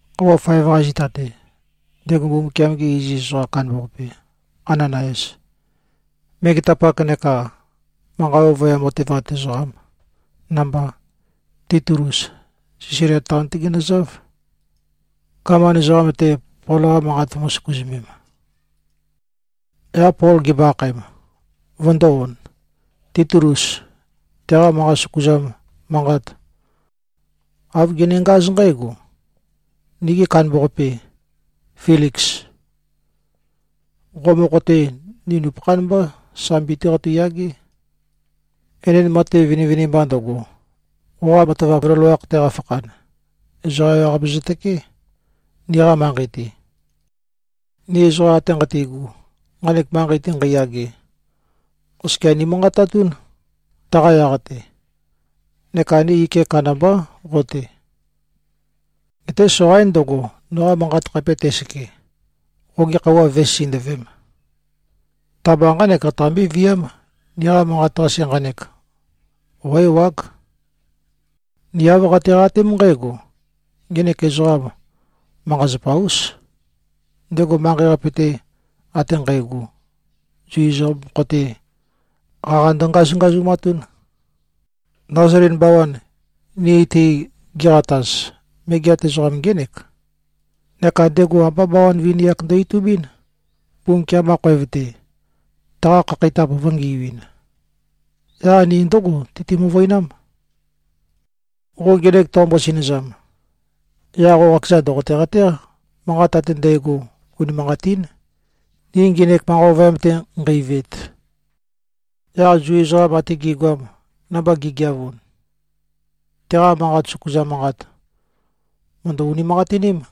Khøuwa faev-qa zita-te, ndego Mbumbukiam-ge iziz ezoqam kandambaqape, Ananayas, megetapak neka manqa ovøyam otevat ezoqam namba, Titulus, Sæzalia taon-té ginøzáv, gaman ezoqam-te, Pol-qa manqa vømǿ-søkuzømēm. Yaq Pol gimbo-akhaem, vøndō-on, Titulus teqa manqa søkuzam manqat, āv genengáz nqǽgo, “Nigi kandambaqape, Filiks. Qo mokho-te, ni nupøkhán mbá, sambi-té qeitøyagé. Enend matev vinivinimba ndøgo, qoqa matavap loloakh-te qafakhan, ezoqa ewaqape zøtøkeé, niqa manqei-te. Ni ezoqa ate nqati꞉gu, nqanek manqei-te nqeiyage, oskia nimanqatatún, taqa yaq-te. Neka ni ike kandambá qo-te. Geté soqaín ndøgo, noqa manqat khape tæseke, qogi khøuwa vǿe-sisindøvēm. Ta-mba nqánek qataqambé-viám. Niqa manqat-qase nqanek, qó-ewág. Ni āv qatiqatém nqǽgo, ngenek ezoqam manqa-zapa-ús. Ndego manqei-qape-te ate nqægo, Zu ezoqam mokho-te, qaqa ndøngazungazumatún. Nazalin bawan, ni-te giqataz, megeat ezoqam ngének. Neka ndego ambá bawan vini-ak ndo-itubín, Mbumbukiam-qa khoev-te, taqa khakheitap vø̄ngiuin. Yaq ni ndǿgo teitø-møvøinám. Qo ngenek toqombo-sinøzam, yaq qo qakezan ndòqote-qatéq, manqat ate ndægo unimanqatín, ni ngenek manqa ovøyam-te nqeiveet.” Yaq Zu ezoqam ate gi꞉goam, namba gi꞉geavun, teqa manqa søkuzam manqat mø̀ndø-unimanqatiním.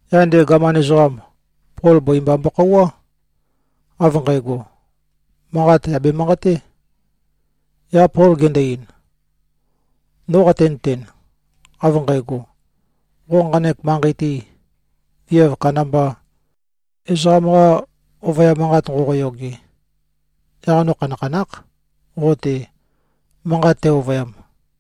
Yaq ndego gaman ezoqam, Pol bøi mba mbokhouwá, av nqægo: Manqat yà bemanqaté. Yaq Pol gendo-ein, “No qatenøten, av nqægo, qo nqanek manqei-te, viav kandamba ezoqam-qa ovøyam manqat nqoqoyoge, yaq no khanakhanákh, qo-te manqat tæ-ovøyam.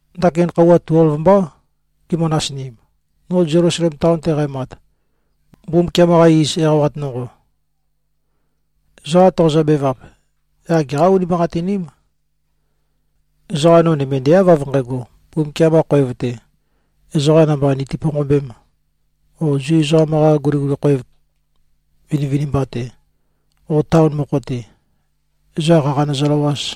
Ndakin khøuwa tuelv mbá gimø-nasinim, no Zelusalem taon-te qæmat, Mbumbukiam-qa iz eqawat nonqo. Ezoqa toqozø-bevap, yaq geqá-unimanqatiním. Ezoqa no nømendeáv, av nqægo, Mbumbukiam-qa khoev-te, ezoqa namba niti-ponqombēm, o Zu ezoqam-qa guliguli khoev vinivinimba-te o taon mokho-te, ezoqa qaqa nøzøløwāz.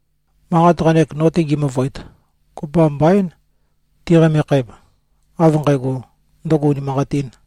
Manqat nqanek, no-te ngi-møvøet, kopømba mbaín ti꞉qamekhem, av nqægo, ndøgo unimanqatīn.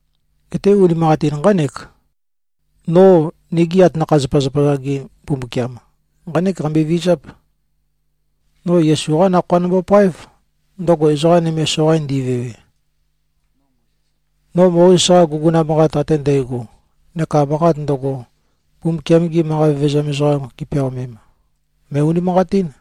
Geté, unimanqatin nqánek: No nigi atanakha-zapazapa-za-ge Mbumbukiam, nqánek qambøe-vizáp: No Yesu-qá Nakhoa nombopáev, ndøgo ezoqa nøme soqain ndivewe. No Mozes-qa guguna manqat ate ndægo neka manqat ndøgo, Mbumbukiam-gi manqa vevezam ezoqam gipeaomem, mø̀e-unimanqatín.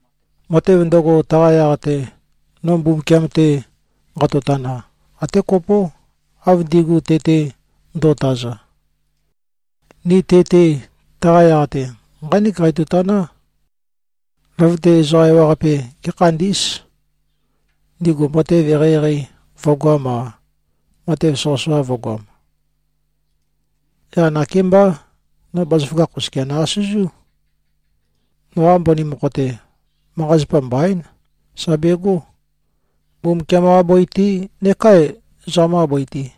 Matev ndøgo, taqa yaq-te no Mbumbukiam-te nqatotana, até kopó, av ndigu te-te nduotaza. Ni te-te taqa yaq-te nqánek qeitotaná: Løvøte ezoqa ewaqape gékhandí꞉z, ndigu matev eqeieqei vø̄goam-a, matev soqøsoqa vø̄goam. Yaq nakémbá, no bazaføgakh oskia nø-asøzú. Noqa mbøni mokho-te, manqa-zapa mbaín, sà begó, Mbumbukiam-qa bøi-te neká ezoqam-qa bøi-te.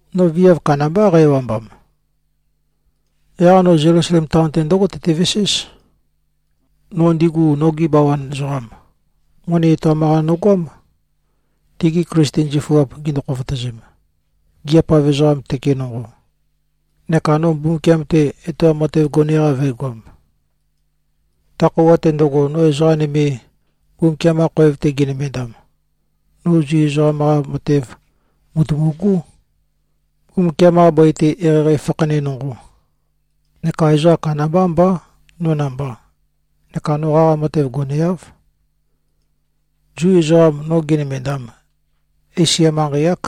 No viav kandambá, qæ-ewambam. Yaq no Zelusalem taon-te ndǿgo tøteveséz. No ndigu nogi bawan ezoqam, moni etoam-qa nogoám, tigi Klisten zifuap gindu-khofotøzem, gigiap-av ezoqam tøke nonqo, neka no Mbumbukiam-te etoam matev gone-qa vø̄egoam. Ta khøuwa-te ndøgo, no ezoqa nøme Mbumbukiam-qa khoev-te ginømendam, no Zu ezoqam-qa matev mùtumugú, Mbumbukiam-qa bøi-te eqeieqei fakhane nonqo. Neka ezoqa kandambá mbá, no namba, neka no qaqa matev goneáv. Zu ezoqam, no ginømendam, Esia manqei-ák.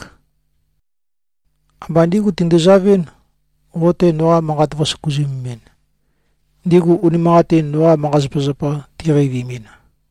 Amba ndígu tinduzavɨ́n, qo-te noqa manqa vø̄søkuzømemɨn, ndigu unimanqatin noqa manqa-zapazapa tiqeivimin.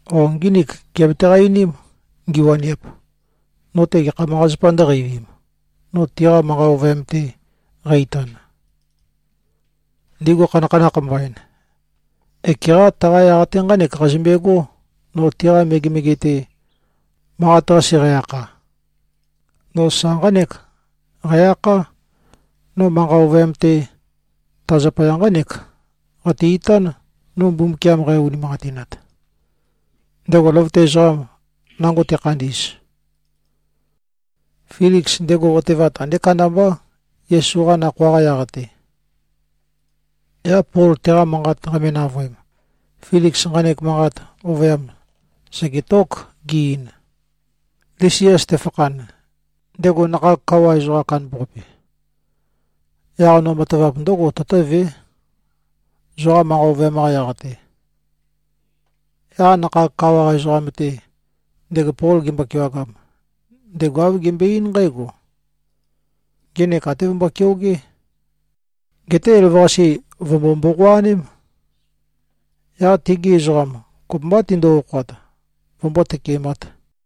O ngínik giabetaqa-einím, ngiwaniap, no-te gekha manqa-zapa ndø̄qeivim, no tiqa manqa ovøyam-te qæ-itan. Ndigu khanakhanakh mbain, ekeqá taqa yaq-te nqánek qazømbegó, no tiqa megemege-te, manqat-qase qæ-akha. No sa nqánek qæ-akhá, ‘No manqa ovøyam-te ta zapaya nqánek qate-itán, no Mbumbukiam nqæ-unimanqatinat, ndego løvøte ezoqam nango tekhandi꞉z.’” Filiks, ndego otevat andé kandambá, Yesu-qa Nakhoa-qa yaq-te. Yaq Pol teqa manqat qame-navøem, Filiks nqanek manqa ovøyam sègetók, ge-ein, “Lisias tefakhan, ndego nakhag kawa ezoqam kandambaqape, yaq no matavap ndǿgo tøtǿvé, zoqa manqa ovøyam-qa yaq-te.” Yaq nakhag kawa ezoqam-te, ndego Pol gembo-kewagam, ndego āv gembøe-eín nqǽgo, “Ngenek até vømbo-keogé. Geté elavøqase vø̀mbo-mboqoaném. Yaq tegi ezoqam kopømbá, tindu-okhoat, vømbó-tøkemāt.”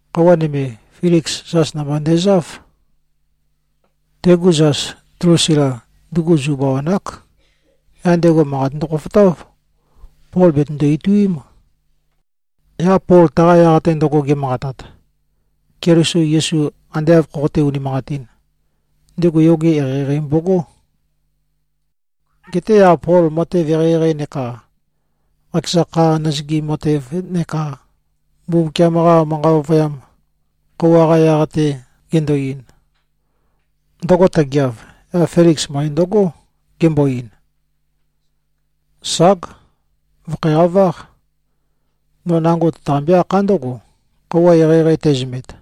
Khøuwa nøme, Filiks, zas namba ndezáv. Tegu zas, Dlusila, ndugu Zu bawan-ák. Yaq ndego manqat ndøkhofotáv, Pol bètøndo-ituím. Yaq Pol taqa yaq-te ndøgo ge꞉manqatat, Keliso Yesu ande āv khoqoté-unimanqatīn, ndego yoge eqeieqei mbogó. Geté yaq Pol matev eqeieqei neka qakeza kha nøzøgim matev neka Mbumbukiam-qa manqa ovøyam khøuwa-qa yaq-te gendo-ein, ndøgo tøgeav, yaq Filiks møe ndǿgo, gembo-ein, “Ság! Vø̀khæqaváq. No nango tøtaqambé-akhá ndǿgo, khøuwa eqeieqei tæzømet.”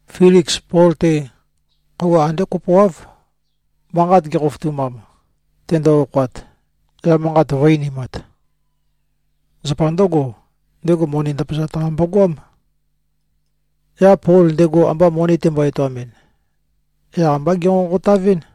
Filiks Pol-te, khøuwa andé kopoáv, manqat gekhofotumam, tendo-okhoat, yaq manqat vø̄-einimat. Zapa ndǿgo, ndego moni ndøpazat-qa mbogoám. Yaq Pol ndego amba moni tembo-etoamɨn, yaq amba gènqonqotavɨ́n.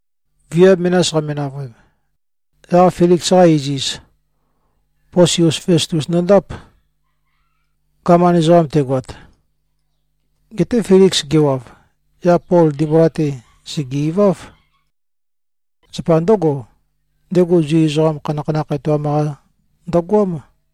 Viav menas qame-navøem, yaq Filiks-qa iziz, Posius Festus ndøndáp, gaman ezoqam tegoat. Geté Filiks gewav, yaq Pol ndimbula-te sège-iváv. Zapa ndǿgo, ndego Zu ezoqam khanakhanakh etoam-qa ndøgoám.